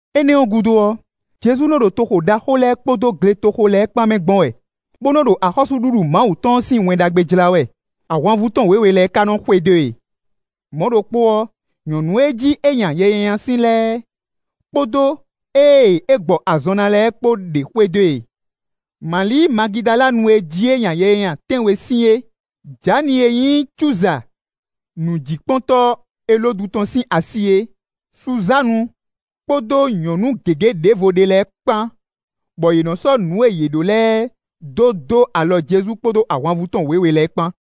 Énɛ́ ɔ́ gúdo ɔ́, Jezu nɔ ɖo toxo ɖaxó lɛ́ɛ kpódó gletoxo lɛ́ɛ kpán mɛ gbɔn wɛ, bó nɔ́ ɖo axɔ́súɖuɖu Mawu tɔn ɔ́ sín Wɛn Ɖagbe jlá wɛ; ahwanvú tɔn wěwe lɛ́ɛ ka nɔ́ xwedó e. Mɔ̌ ɖokpó ɔ́, nyɔ̌nu e jí é nya yɛ nyanya sín lɛ́ɛ, kpódó ée é gbɔ azɔn ná lɛ́ɛ kpó ɖě xwedó e: Mali Magidalanu e jí é nya yɛ nyanya tɛ́nwe sín é, Jani e nyí Cúza nǔjíkpɔ́ntɔ́ Elódu tɔn sín asi é, Suzánu, kpódó nyɔ̌nu gěgé ɖěvo ɖé lɛ́ɛ kpán, bɔ yě nɔ́ sɔ́ nǔ e yě ɖó lɛ́ɛ dó dó alɔ Jezu kpódó ahwanvú tɔn wěwe lɛ́ɛ kpán.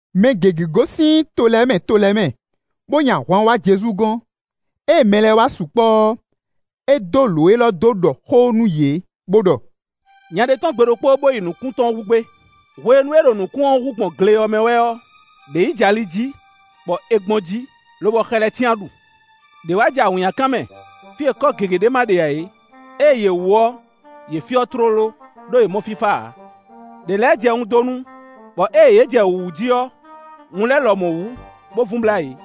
Mɛ gěgé gosín to lɛ́ɛ mɛ, to lɛ́ɛ mɛ, bó nyi ahwan wá Jezu gɔ́n. Ée mɛ lɛ́ɛ wá sukpɔ́ ɔ́, é dó lǒ élɔ́ dó ɖɔ xó nú yě, bó ɖɔ: “Nya ɖé tɔ́n gbe ɖokpó, bó yi nǔkún tɔn hú gbé. Hwenu e é ɖo nǔkún ɔ́ hú gbɔn gle ɔ́ mɛ wɛ ɔ́, ɖě yi jɛ ali jí, bɔ è gbɔn jí, lobɔ xɛ lɛ́ɛ cyán ɖu. Đě wá jɛ awǐnnyakan mɛ, fí e kɔ́ gěgé ɖé ma ɖe ǎ é; ée yě wú ɔ́, yě fyɔ́ tlóló, ɖó yě mɔ fífá ǎ. Đě lɛ́ jɛ wundonu, bɔ ée yě jɛ wǔwú jí ɔ́, wun lɛ́ɛ lɔmɔ̌ wú, bó vun blá yě.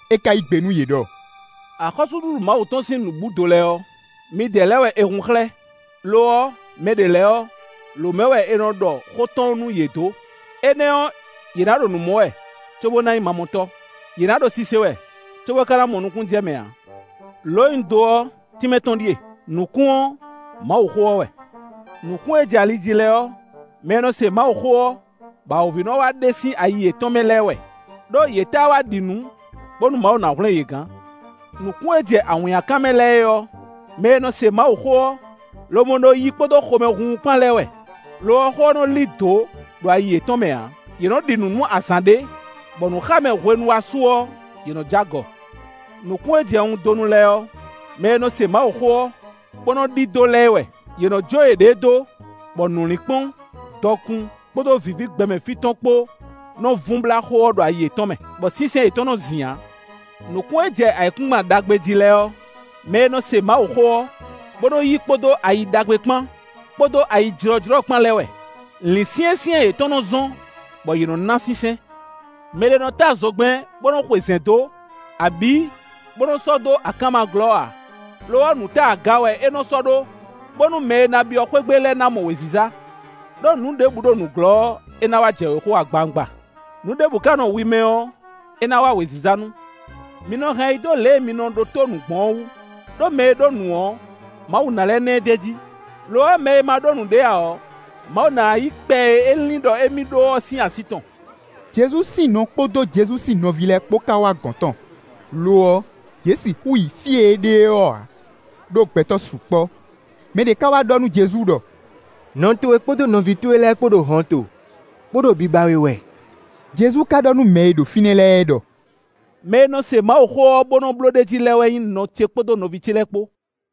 É ka yí gbe nú yě ɖɔ: “Axɔ́súɖuɖu Mawu tɔn sín nǔbúdo lɛ́ɛ ɔ́, midɛɛ lɛ́ɛ wɛ è hun xlɛ́; lo ɔ́, mɛ ɖě lɛ́ɛ ɔ́, lǒ mɛ wɛ è nɔ ɖɔ xó tɔn nú yě dó. Énɛ́ ɔ́, yě ná ɖo nǔ mɔ wɛ, cóbó ná nyí mamɔtɔ́; yě ná ɖo sise wɛ, cóbó ká ná mɔ nukúnnú jɛ mɛ ǎ.” “Lǒ e un dó ɔ́, tínmɛ tɔn ɖíe: nǔkún ɔ́, Mawuxó ɔ́ wɛ. Nǔkún e jɛ ali jí lɛ́ɛ ɔ́, mɛ e nɔ se Mawuxó ɔ́, bɔ awǒvi nɔ́ wá ɖe sín ayi yětɔn mɛ lɛ́ɛ é wɛ; ɖó, yě tá wá ɖi nǔ, bónú Mawu ná hwlɛ́n yě gán. Nǔkún e jɛ awǐnnyakan mɛ lɛ́ɛ é ɔ́, mɛ e nɔ se Mawuxó ɔ́, lobo nɔ yí kpódó xomɛhunhun kpán lɛ́ɛ wɛ; lo ɔ́, xó ɔ́ nɔ lí dǒ ɖo ayi yětɔn mɛ ǎ, yě nɔ́ ɖi nǔ nú azǎn ɖé; bɔ nǔxámɛ hwenu wá su ɔ́, yě nɔ́ jó agɔ. Nǔkún e jɛ wundonu lɛ́ɛ ɔ́, mɛ e nɔ se Mawuxó ɔ́, bó nɔ́ ɖidó lɛ́ɛ é wɛ; yě nɔ́ jó yěɖée dó, bɔ nǔlinkpɔ́n, dɔkun, kpódó vǐví gbɛmɛ fí tɔn kpó nɔ vun blá xó ɔ́ ɖo ayi yětɔn mɛ, bɔ sínsɛ́n yětɔn nɔ zin ǎ. Nǔkún e jɛ ayǐkúngban ɖagbe jí lɛ́ɛ ɔ́, mɛ e nɔ se Mawuxó ɔ́, bó nɔ́ yí kpódó ayi ɖagbe kpán, kpódó ayijlɔ́jlɔ́ kpán lɛ́ɛ wɛ; lǐnsyɛ́nsyɛ́n yětɔn nɔ́ zɔ́n, bɔ yě nɔ́ ná sínsɛ́n.” “Mɛ ɖé nɔ́ tá zogbɛ́n bó nɔ́ xwe zɛ̌n dó, abǐ bó nɔ́ sɔ́ dó akánma glɔ́ ǎ; lo ɔ́, nǔta aga wɛ è nɔ sɔ́ ɖó, bónú mɛ e ná byɔ́ xwé gbe lɛ́ɛ ná mɔ wěziza. Đó nǔ ɖěbǔ ɖo nǔglɔ́ ɔ́, é ná wá jɛ wěxo agbawungba; nǔ ɖěbǔ ka nɔ wi mɛ ɔ́, é ná wá wěziza nu. “Mi nɔ hɛn ayi dó lě e mi nɔ ɖótó nǔ gbɔn ɔ́ wú; ɖó mɛ e ɖó nǔ ɔ́, Mawu ná lɛ́ ná ɛ d'é jí, lo ɔ́, mɛ e ma ɖó nǔɖé ǎ ɔ́, Mawu ná yí kpɛ e é lin ɖɔ émí ɖó ɔ́ sín así tɔn.” Jezu sín nɔ kpódó Jezu sín nɔví lɛ́ɛ kpó ka wá gɔ̌n tɔn; lo ɔ́, yě sixú yi fí e é ɖe ɔ́ ǎ, ɖó gbɛtɔ́ sukpɔ́. Mɛ ɖé ka wá ɖɔ nú Jezu ɖɔ: “Nɔ towe kpódó nɔví towe lɛ́ɛ kpó ɖo hɔnto, bó ɖo biba we wɛ.” Jezu ka ɖɔ nú mɛ e ɖo fínɛ́ lɛ́ɛ ɖɔ: “Mɛ e nɔ se Mawuxó ɔ́, bó nɔ́ bló ɖ'é jí lɛ́ɛ wɛ nyí nɔ ce kpódó nɔví ce lɛ́ɛ kpó.”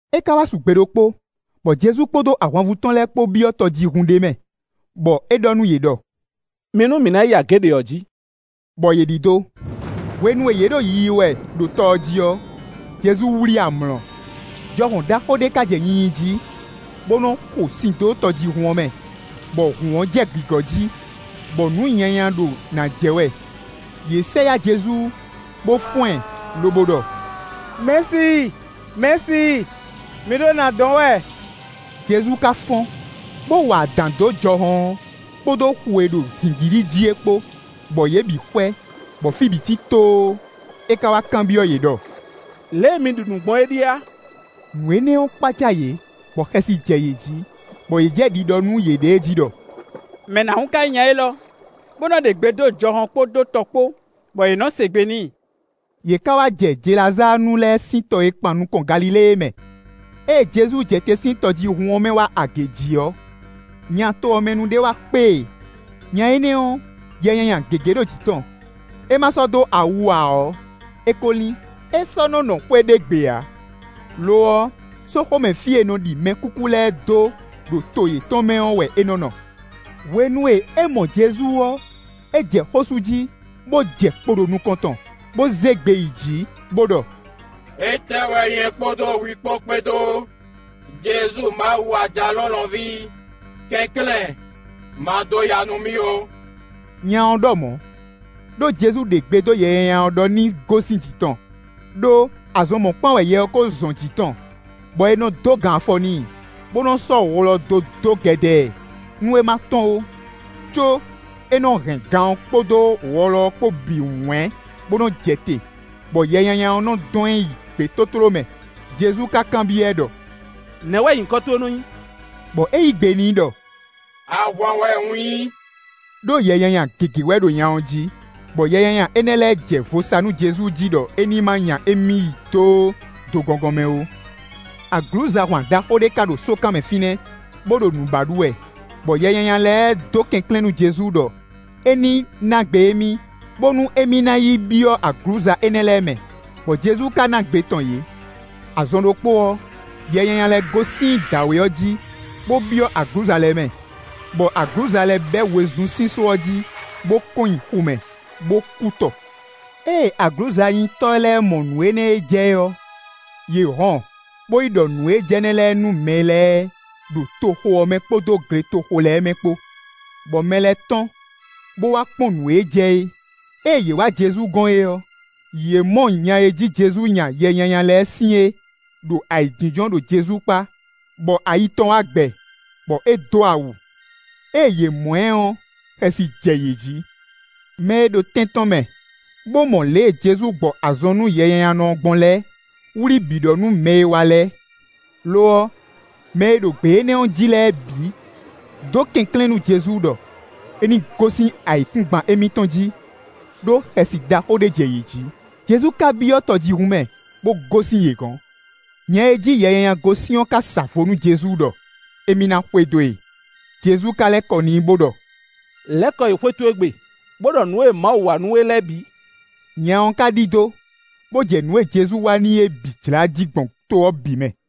É ka wá su gbe ɖokpó, bɔ Jezu kpódó ahwanvú tɔn lɛ́ɛ kpó byɔ́ tɔjíhún ɖé mɛ, bɔ é ɖɔ nú yě ɖɔ: “Mi nú mǐ nǎ yi agě ɖě ɔ́ jí,” bɔ yě ɖidó. Hwenu e yě ɖo yiyi wɛ ɖo tɔ ɔ́ jí ɔ́, Jezu wlí amlɔ. Jɔhɔn ɖaxó ɖé ka jɛ nyinyi jí, bó nɔ́ xo sin dó tɔjíhún ɔ́ mɛ, bɔ hǔn ɔ́ jɛ gǐgɔ́ jí, bɔ nǔ nyanya ɖo nǎ jɛ wɛ. Yě sɛ yá Jezu, bó fɔ́n ɛ, lobo ɖɔ: “Mɛ̌si! Mɛ̌si! Mǐ ɖo nǎ dɔn wɛ.” Jezu ka fɔ́n, bó wa adǎn dó jɔhɔn ɔ́, kpódó xu e ɖo zǐngídi jí é kpó, bɔ yě bǐ xwɛ, bɔ fí bǐ cí tóó. É ka wá kanbyɔ́ yě ɖɔ: “Lě e mi ɖi nǔ gbɔn ɔ́ ɖíe a?” Nǔ énɛ́ ɔ́ kpácá yě, bɔ xɛsi jɛ yě jí, bɔ yě jɛ ɖiɖɔ nú yěɖée jí ɖɔ: “Mɛ nǎhún ka nyí nya élɔ́, bó nɔ́ ɖe gbe dó jɔhɔn kpódó tɔ kpó, bɔ yě nɔ́ se gbe n'i?” Yě ká wá jɛ Jelazáanu lɛ́ɛ sín to e kpan nukɔn Galilée é mɛ. Ée Jezu jɛ te sín tɔjíhún ɔ́ mɛ wá agě jí ɔ́, nya to ɔ́ mɛ nu ɖé wá kpé e. Nya énɛ́ ɔ́, yɛ nyanya gěgé ɖo jǐ tɔn; é ma sɔ́ dó awu ǎ ɔ́, é ko lín; é sɔ́ nɔ́ nɔ xwé ɖé gbe ǎ; lo ɔ́, sóxo mɛ fí e è nɔ ɖi mɛkúkú lɛ́ɛ dó ɖo to yětɔn mɛ ɔ́ wɛ é nɔ́ nɔ. Hwenu e é mɔ Jezu ɔ́, é jɛ xó sú jí, bó jɛ kpo ɖo nukɔn tɔn, bó zé gbe yi jǐ, bó ɖɔ: “Étɛ́ wɛ nyɛ kpódó hwi kpó kpédó, Jezu Mawu Ajalɔ̌nlɔn ví? Kɛnklɛ́n, ma dó ya nú mì ó.” Nya ɔ́ ɖɔ mɔ̌, ɖó Jezu ɖe gbe dó yɛ nyanya ɔ́ ɖɔ ní gosín jǐ tɔn. Đó azɔn mɔ̌kpán wɛ yɛ ɔ́ kó zɔn jǐ tɔn, bɔ è nɔ dó gan afɔ n'i, bó nɔ sɔ́ wɔlɔ dó dó gɛdɛ ɛ, nú é ma tɔ́n ó; có é nɔ hɛn gan ɔ́ kpódó wɔlɔ ɔ́ kpó bǐ wɛ̌n, bó nɔ́ jɛ te, bɔ yɛ nyanya ɔ́ nɔ dɔn ɛ yi gbětótló mɛ. Jezu ka kanbyɔ́ ɛ ɖɔ: “Nɛ̌ wɛ nyǐkɔ towe nɔ nyí?” Bɔ é yí gbe n'i ɖɔ: “Ahwan wɛ un nyí,” ɖó yɛ nyanya gěgé wɛ ɖo nya ɔ́ jí. Bɔ yɛ nyanya énɛ́ lɛ́ɛ jɛ vo sa nú Jezu jí ɖɔ é ní má nya émí yi dó do gɔngɔn mɛ ó. Aglǔzahwan ɖaxó ɖé ka ɖo sókan mɛ fínɛ́, bó ɖo nǔ ba ɖu wɛ. Bɔ yɛ nyanya lɛ́ɛ dó kɛnklɛ́n nú Jezu ɖɔ é ní ná gbe émí, bónú émí ná yi byɔ́ aglǔza énɛ́ lɛ́ɛ mɛ, bɔ Jezu ka ná gbe tɔn yě. Azɔn ɖokpó ɔ́, yɛ nyanya lɛ́ɛ gosín dǎwe ɔ́ jí, bó byɔ́ aglǔza lɛ́ɛ mɛ, bɔ aglǔza lɛ́ɛ bɛ́ wezun sín só ɔ́ jí, bó kɔn nyi xu mɛ, bó kú tɔ. Ée aglǔzanyitɔ́ lɛ́ɛ mɔ nǔ énɛ́ e jɛ ɔ́, yě hɔn, bó yi ɖɔ nǔ e jɛ nɛ́ lɛ́ɛ nú mɛ lɛ́ɛ ɖo toxo ɔ́ mɛ kpódó gletoxo lɛ́ɛ mɛ kpó. Bɔ mɛ lɛ́ɛ tɔ́n, bó wá kpɔ́n nǔ e jɛ é. Ée yě wá Jezu gɔ́n é ɔ́, yě mɔ nya e jí Jezu nya yɛ nyanya lɛ́ɛ sín é ɖo ayǐjínjɔ́n ɖo Jezu kpá, bɔ ayi tɔn wá gbɛ, bɔ é dó awu. Ée yě mɔ ɛ ɔ́, xɛsi jɛ yě jí. Mɛ e ɖo tɛn tɔn mɛ bó mɔ lě e Jezu gbɔ azɔn nú yɛnyanyanɔ ɔ́ gbɔn lɛ́ɛ wlí bǐ ɖɔ nú mɛ e wá lɛ́ɛ. Lo ɔ́, mɛ e ɖo gbě énɛ́ ɔ́ jí lɛ́ɛ bǐ dó kɛnklɛ́n nú Jezu ɖɔ é ní gosín ayǐkúngban émítɔn jí, ɖó xɛsi ɖaxó ɖé jɛ yě jí. Jezu ka byɔ́ tɔjíhún mɛ, bó gosín yě gɔ̌n. Nya e jí yɛ nyanya gosín ɔ́ ka sa vo nú Jezu ɖɔ émí ná xwedó e. Jezu ka lɛ́ kɔ n'i bó ɖɔ: “Lɛ̌ kɔ yi xwé towe gbe, bó ɖɔ nǔ e Mawu wa nú we lɛ́ɛ bǐ.” Nya ɔ́ ka ɖidó, bó jɛ nǔ e Jezu wa n'i é bǐ jlá jí gbɔn to ɔ́ bǐ mɛ.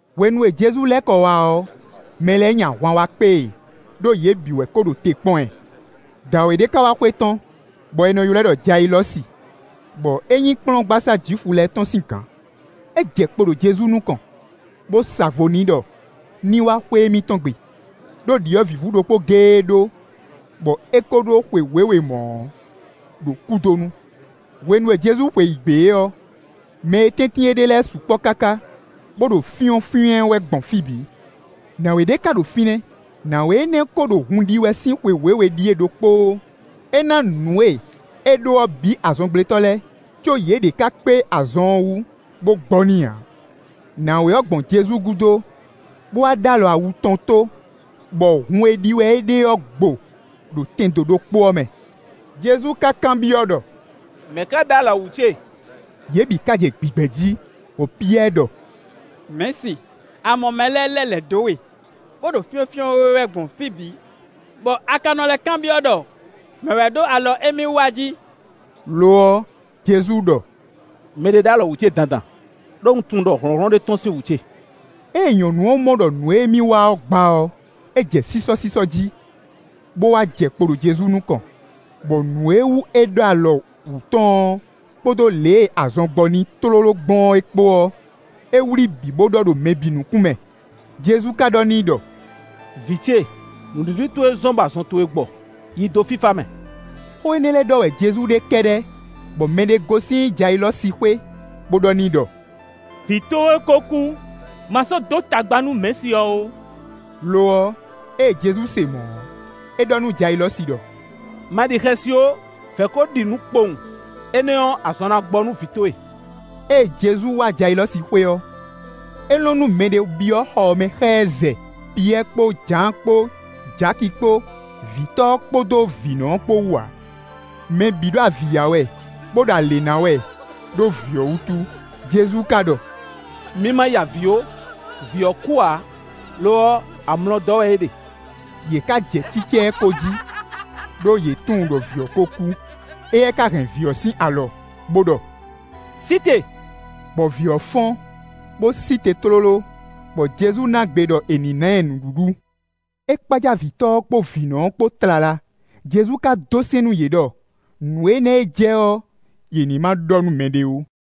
Hwenu e Jezu lɛ́ kɔ wá ɔ́, mɛ lɛ́ɛ nyi ahwan wá kpé e, ɖó yě bǐ wɛ ko ɖo te kpɔ́n ɛ. Dǎwe ɖé ka wá xwetɔ́n, bɔ è nɔ ylɔ́ ɛ ɖɔ Jayilɔ́si, bɔ é nyí kplɔ́ngbasá Jwifu lɛ́ɛ tɔn sín gǎn. É jɛ kpo ɖo Jezu nukɔn, bó sa vo n'i ɖɔ ní wá xwé émítɔn gbe, ɖó ɖyɔ̌vǐvú ɖokpó géé é ɖó, bɔ é ko ɖó xwe wěwe mɔ̌ ɔ́ ɖo kúdonu. Hwenu e Jezu xweyǐgbe ɔ́, mɛ e tɛ́ntin é ɖe lɛ́ɛ sukpɔ́ káká, bó ɖo fyɔ́nfyɔ́n ɛ wɛ gbɔn fí bǐ. Nǎwe ɖé ka ɖo fínɛ́. Nǎwe énɛ́ kó ɖo hun ɖi wɛ sín xwe wěwe ɖíe ɖokpóó. É ná nǔ e é ɖó ɔ́ bǐ azɔngblétɔ́ lɛ́ɛ, có yě ɖě ká kpé azɔn ɔ́ wú bó gbɔ n'i ǎ. Nǎwe ɔ́ gbɔn Jezu gúdo, bó wá ɖó alɔ awu tɔn tó, bɔ hun e ɖi wɛ é ɖe ɔ́ gbo ɖo tɛndo ɖokpó ɔ́ mɛ. Jezu ka kanbyɔ́ ɖɔ: “Mɛ̌ ká ɖó alɔ wǔ ce?” Yě bǐ ka jɛ gbigbɛ jí, bɔ Piyɛ́ɛ ɖɔ: “Mɛ̌si, a mɔ mɛ lɛ́ɛ lɛ́ lɛ̌ dó we, bó ɖo fyɔ́nfyɔ́n we wɛ gbɔn fí bǐ, bɔ a ka nɔ lɛ́ kanbyɔ́ ɖɔ mɛ̌ wɛ ɖó alɔ émí wú a jí.” Lo ɔ́, Jezu ɖɔ: “Mɛ ɖé ɖó alɔ wú ce dandan; ɖó un tunwun ɖɔ hlɔ̌nhlɔ́n ɖé tɔ́n sín wú ce.” Ée nyɔ̌nu ɔ́ mɔ ɖɔ nǔ e émí wa ɔ́ gba ɔ́, é jɛ sísɔ́sísɔ́ jí, bó wá jɛ kpo ɖo Jezu nukɔn, bɔ nǔ e wú é ɖó alɔ wǔ tɔn ɔ́, kpódó lě e azɔn gbɔ n'i tlóló gbɔn é kpó ɔ́, é wlí bǐ bó ɖɔ ɖo mɛ bǐ nukún mɛ. Jezu ka ɖɔ n'i ɖɔ: “Vǐ ce, nǔɖiɖi towe zɔ́n bɔ azɔn towe gbɔ. Yi dó fífá mɛ!” Xó énɛ́ lɛ́ɛ ɖɔ wɛ Jezu ɖe kɛ́ɖɛ́ bɔ mɛɖé gosín Jayilɔ́si xwé, bó ɖɔ n'i ɖɔ: “Vǐ towe kó kú, ma sɔ́ dó tagba nú mɛ̌si ɔ́ ó.” Lo ɔ́, ée Jezu se mɔ̌ ɔ́, é ɖɔ nú Jayilɔ́si ɖɔ: “Ma ɖi xɛsi ó, vɛ̌ ko ɖi nǔ kpowun, énɛ́ ɔ́, azɔn na gbɔ nú vǐ towe.” Ée Jezu wá Jayilɔ́si xwé ɔ́, é lɔn nú mɛɖé byɔ́ xɔ ɔ́ mɛ xá ɛ zɛ Piyɛ́ɛ kpó Jǎan kpó Jaki kpó, vǐtɔ́ ɔ́ kpódó vǐnɔ kpó wú ǎ. Mɛ bǐ ɖo avǐ ya wɛ, bó ɖo alě ná wɛ ɖó vǐ ɔ́ wútu. Jezu ka ɖɔ: “Mi ma ya avǐ ó, vǐ ɔ́ kú ǎ; lo ɔ́, amlɔ dɔ́ wɛ é ɖe.” Yě ká jɛ cícá ɛ ko jí, ɖó yě tunwun ɖɔ vǐ ɔ́ kó kú. Éyɛ́ ká hɛn vǐ ɔ́ sín alɔ, bó ɖɔ: “Sí te!” Bɔ vǐ ɔ́ fɔ́n, bó sí te tlóló; bɔ Jezu ná gbe ɖɔ è nǐ ná ɛ nǔɖuɖu. É kpácá vǐtɔ́ ɔ́ kpó vǐnɔ ɔ́ kpó tlala, Jezu ka dó sɛ́n nú yě ɖɔ nǔ énɛ́ e jɛ ɔ́ yě ní má ɖɔ nú mɛɖé ó.